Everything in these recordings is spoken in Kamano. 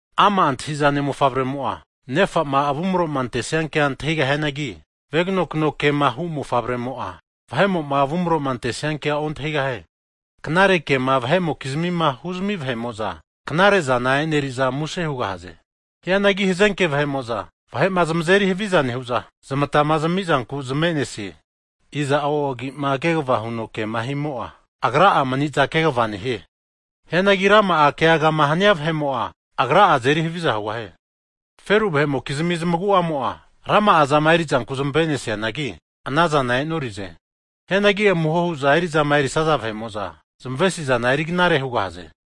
Ama' antahizane mofavremo'a nefa'ma avumroma antesiankea antahigahianagi, veganokano kema hu mofavremo'a, vahe'mo'ma avumroma antesiankea ontahigahie. Knare kema vahe'mokizmima huzmi vahe'mo'za, knare zana e'neriza muse hugahaze. Hianagi hazenke vahe'mo'za, vahe'ma zmazeri haviza nehu'za zmatama zamizanku zmave'nesie. Iza'o agi'ma kegavama huno kema himo'a, agra'a maniza kegva nehie. Hianagi rama'a keagama hania vahe'mo'a, agra'a azeri haviza hugahie. Feru vahe'mokizmi zmagu'amo'a, rama'a zama erizanku zmave'nesianagi, anazana e'norize. Hianagi amuho hu'za eri'zama erisaza vahe'mo'za, zmavesizana eri knare hugahaze.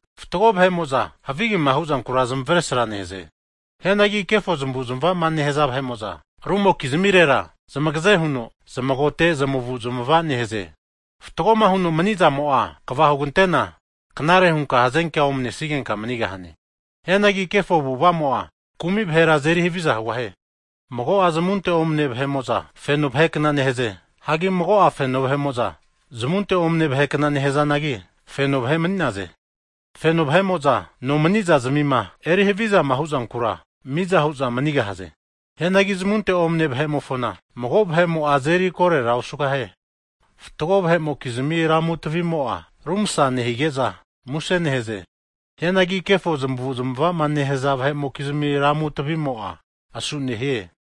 Fatgo vahe'mo'za havigema huzankura zamavesra nehaze. Hianagi kefo zamavu'zamava nehaza vahe'mo'za, rumokizmirera zmagaze huno zamagote zmavu'zmava nehaze. Fatgoma huno manizamo'a kva hugantena, knare hunka hazenkea omanesigenka manigahane. Hianagi kefo avu'avamo'a, kumi vahera azeri haviza hugahie. Mago'a zmunte omane vahe'mo'za, feno vahe kna nehaze. Hagi mago'a feno vahe'mo'za, zamunte omane vahe kna nehazanagi, feno vahe mani'naze. Feno vahe'mo'za nomaniza'zmima eri havizama huzankura, miza hu'za manigahaze. Hianagi zamunte'ma omane vahe'mofona, mago vahe'mo'a azeri korera osugahie. Fatgo vahe'mokizmi lamu tavimo'a, ru masa nehige'za, muse nehaze. Hianagi kefo zamavu'zamavama nehaza vahe'mokizmi lamu tavimo'a, asu nehie.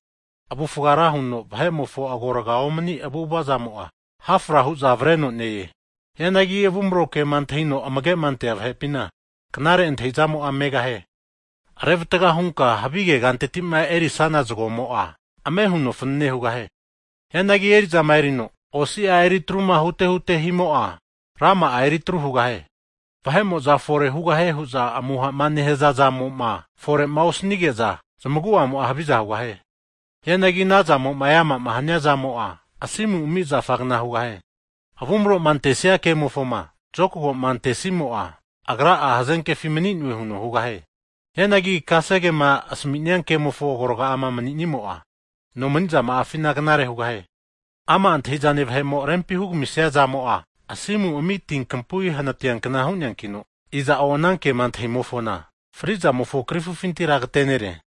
Avufga ra huno vahe'mofo agorga omani avu'avazamo'a, ha' fra hu'za avreno ne-e. Hianagi avumro kema antahino amagema ante vahe'pina, knare antahizamo'a megahie. Revatga hunka havige kantetima eri'sana zgomo'a, ame huno fanane hugahie. Hianagi eri'zama erino, osia eri atruma hute hutema himo'a, rama'a eri atru hugahie. Vahe'mo'za fore hugahie huza amuha nehaza zamo'ma fore'ma osanige'za, zmagu'amo'a haviza hugahie. Hianagi ana zamo'ma e'ama'ma hania zamo'a, asimu ami zafagna hugahie. Avumroma antesia kemofoma zokagoma antesimo'a, agra'a hazenkefi mani'noe huno hugahie. Hianagi kasegema asaminia kemofo agorga'ama maninimo'a, nomanizama'afina knare hugahie. Ama' antahizane vahe'mo rempima hugamisia zamo'a, asimu ami ti kapui hanatiankna hu'neankino, iza'o ana kema antahimofona, frizamofo krifufintira agatenere.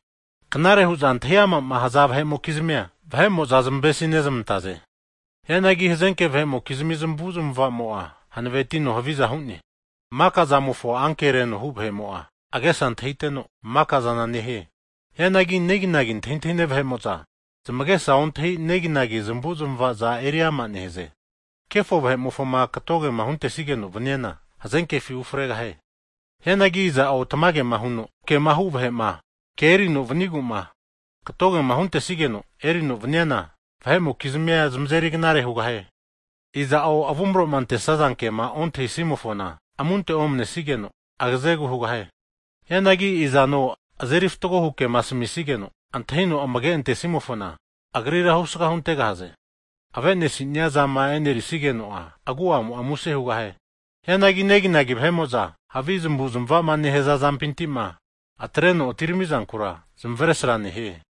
Knare hu'za antahi amama haza vahe'mokizmia, vahe'mo'za zamavesi nezamantaze. Hianagi hazenke vahe'mokizmi zmavu'zmavamo'a, hanavetino haviza hu'ne. Maka zamofo ankereno hu vahe'mo'a agesa antahiteno, maka zana nehie. Hianagi neginagi antahintahine vahe'mo'za, zamagesa ontahi neginagi zmavu'zmavaza eri ama nehaze. Kefo vahe'mofoma katogema huntesigeno vaniana, hazenkefi ufregahie. Hianagi iza'o tamagema huno kema hu vahe'ma, ke erino vanigu'ma katogema huntesigeno erino vaniana, vahe'mokizmia zmazeri knare hugahie. Iza'o avumaroma antesaza kema ontahisimofona amunte omnesigeno, agazegu hugahie. Hianagi izano azeri fatgohu kema asamisigeno antahino amage antesimofona, agrira husaga huntegahaze. Avenesinia zama e'nerisigeno'a, agu'amo'a muse hugahie. Hianagi neginagi vahe'mo'za havi zmavu'zmavama nehaza zampintima atreno atiramizankura zmavesra nehie.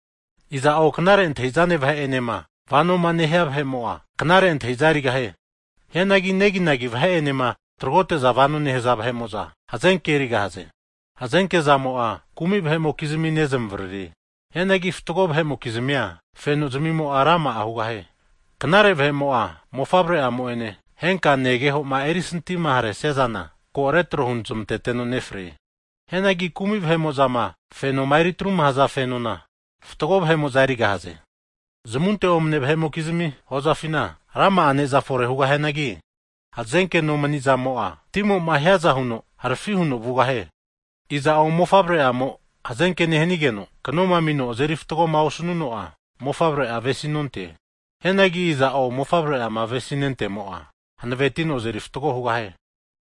Iza'o knare antahizane vahe enema vanoma nehia vahe'mo'a, knare antahiza erigahie. Hianagi neginagi vahe enema tagrote'za vanoma nehaza vahe'mo'za, hazenke erigahaze. Hazenke zamo'a kumi vahe'mokizmi nezmavaririe. Hianagi fatgo vahe'mokizmia, fenozmimo'a rama'a hugahie. Knare vahe'mo'a mofavre'amo'ene henka negehoma eri sintima haresia zana, ko retro huzmanteteno nefrie. Hianagi kumi vahe'mo'zama fenoma eri atruma haza fenona, fatgo vahe'mo'za erigahaze. Zamunte omane vahe'mokizmi hozafina, rama'a neza fore hugahianagi hazenke nomanizamo'a timo'ma hiaza huno harafi huno vugahie. Iza'o mofavre'amo hazenke nehanigeno knoma amino azeri fatgoma osanuno'a, mofavre'a avesinonte. Hianagi iza'o mofavre'ama avesima nentemo'a, hanavetino azeri fatgo hugahie.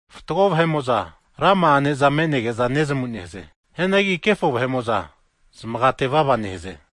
Fatgo vahe'mo'za rama'a ne'za me'nege'za nezamu nehaze. Hianagi kefo vahe'mofoza, zamaga tevava nehaze.